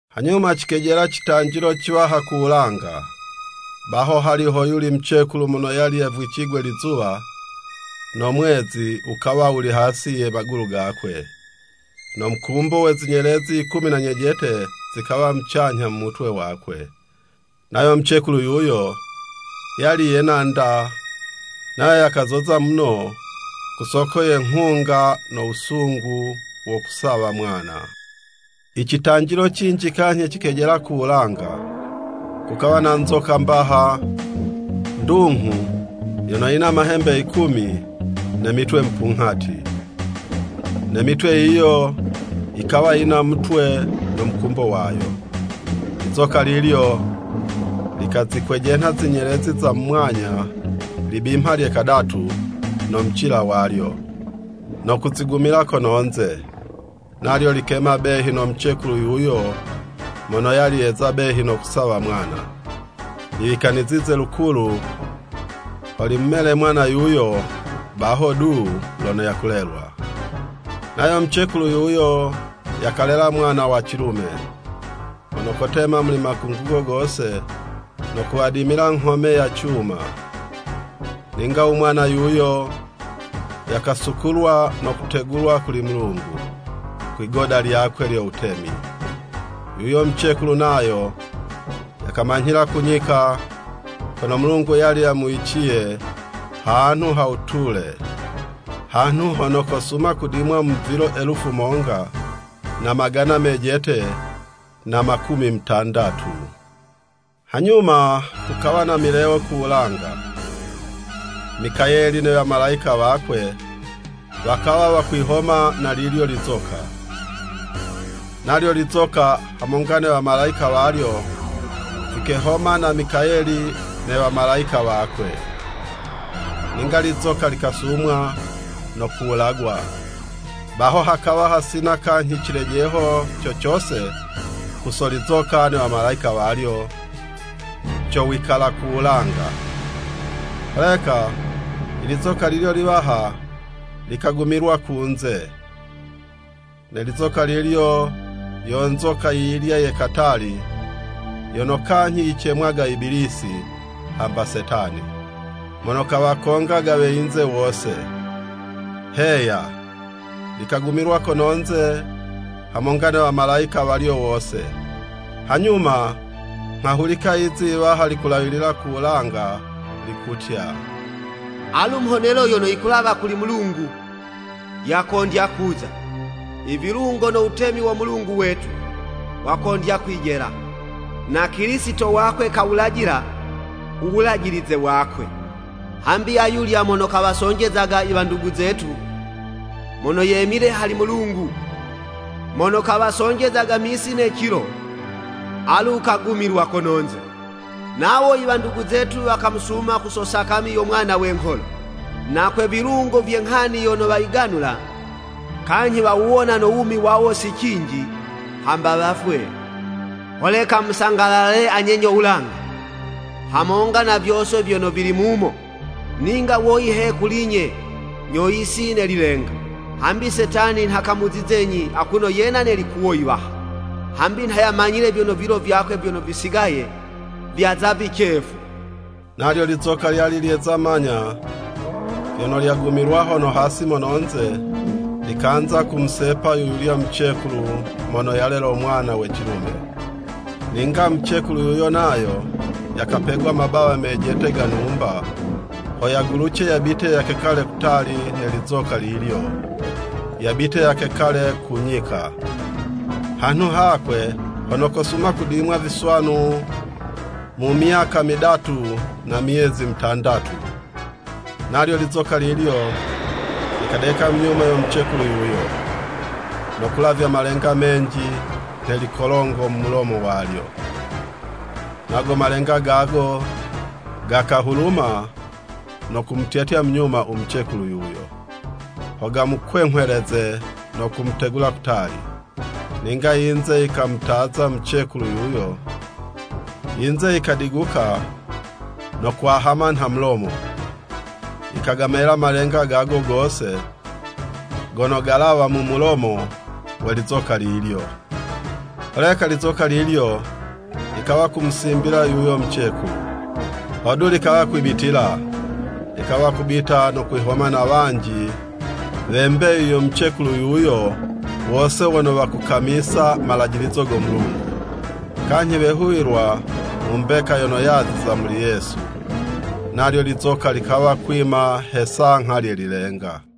Hanyuma cikejela citanjilo ciwaha ku wulanga. Baho hali hoyuli mucekulu mono yali yavwicigwe lizuwa, no mwezi wukawa wuli hasi ye magulu gakwe, no mukumbo we zinyelezi yikumi na nyejete, zikawa mucanyha mu mutwe wakwe! Nayo mucekulu yuyo, yali yena'nda, nayo yakazoza muno ku soko ye nghunga no wusungu wo kusawa mwana. I citanjilo cinji kanyhi cikejela ku wulanga. Kukawa na nzoka mbaha, ndunghu, yono yina mahembe yikumi, ne mitwe mupunghati, ne mitwe yiyo yikawa yina mutwe, no mukumbo wayo. Lizoka lilyo likazikwejenha zinyelezi za mu mwanya, libimha lye kadatu, no mucila walyo, no kuzigumila kono'nze. Nalyo likema behi no mucekulu yuyo mono yali yeza behi no kusawa mwana, liwikanizize lukulu ho limumele mwana yuyo, baho du lono yakulelwa. Nayo mucekulu yuyo yakalela mwana wa cilume, mono kotema muli makungugo gose no kuwadimila nghome ya cuma. Ninga u mwana yuyo, yakasukulwa no kutegulwa kuli Mulungu, kwi'goda lyakwe lyo wutemi. Yuyo mucekulu nayo, yakamanyhila ku nyika, kono Mulungu yali yamuwiciye hanhu ha wutule, hanhu hono kosuma kudimwa mu vilo elufu monga, na magana mejete, na makumi mutandatu. Hanyuma kukawa ne milewo ku wulanga, Mikayeli ne wamalayika wakwe, wakawa wakwihoma na lilyo lizoka. Nalyo lizoka hamonga ne wamalayika walyo, vikehoma na Mikayeli ne wamalayika wakwe. Ninga lizoka likasumwa, no kuwulagwa, baho hakawa hasina kanyhi cilejeho co cose ku so lizoka ne wamalayika walyo co wikala ku wulanga. Holeka ilizoka lilyo liwaha, likagumilwa kunze. Ne lizoka lilyo, yo nzoka yi yilya ye katali, yono kanyhi yicemwaga Ibilisi hamba Setani, mono kawakongaga we yinze wose. Heya likagumilwa kono'nze hamonga ne wamalayika walyo wose. Hanyuma nghahulika lizi yiwaha likulawilila ku wulanga, likutya, “Alu mhonelo yono yikulawa kuli Mulungu, yakondya kuza! I vilungo no wutemi wo Mulungu wetu, wakondya kwijela. Na Kilisito wakwe kawulajila u wulajilize wakwe! Hambi ayulya mono kawasonjeza i wandugu zetu, mono yemile hali Mulungu, mono kawasonjezaga misi ne cilo, alu kagumilwa kononze. Nawo iwandugu zetu wakamusuma ku so sakami yo Mwana we ngholo, na kwe vilungo vye nghani yono wayiganula, kanyhi wawuwona no wumi wawo si cinji, hamba wafwe. Holeka musangalale anye nyo wulanga, hamonga na vyose vyono vili mumo. Ninga woyi he kuli'nye nyo yisi ne lilenga, hambi Setani nha kamuzizenyi akuno yena ne likuwo yiwaha, hambi nha yamanyile vyono vilo vyakwe vyono visigaye vyaza vicefu.” Nalyo lizoka lyali lyeza manya vyono lyagumilwa hono hasi mono'nze, likanza kumusepa yu yulya mucekulu mono yalelo mwana we cilume. Ninga mucekulu yuyo, nayo yakapegwa mabawa mejete ga numba, ho yaguluce yabite yakekale kutali ne lizoka lilyo, yabite yakekale ku nyika, hanhu hakwe hono kosuma kudimwa viswanu mu myaka midatu na myezi mutandatu. Nalyo lizoka lilyo likadeka mu nyuma yo mucekulu yuyo, no kulavya malenga menji nhe kolongo mu mulomo walyo, nago malenga gago gakahuluma no kumutyatya munyuma u mucekulu yuyo, ho gamukwenghweleze no kumutegula kutali. Ninga yinze yikamutaza mucekulu yuyo, yinze yikadiguka no kwahama nha mulomo, yikagamela malenga gago gose gono galawa mu mulomo we lizoka lilyo. Holeka lizoka lilyo likawa kumusimbila yuyo mucekulu, hodu likawa kwibitila, likawa kubita no kwihoma na wanji we mbeyu yo mucekulu yuyo wose wono wakukamisa malajilizo go Mulungu, kanyhi wehuwilwa mu mbeka yono yaziza muli Yesu. Nalyo lizoka likawa kwima he 'sangha lye lilenga.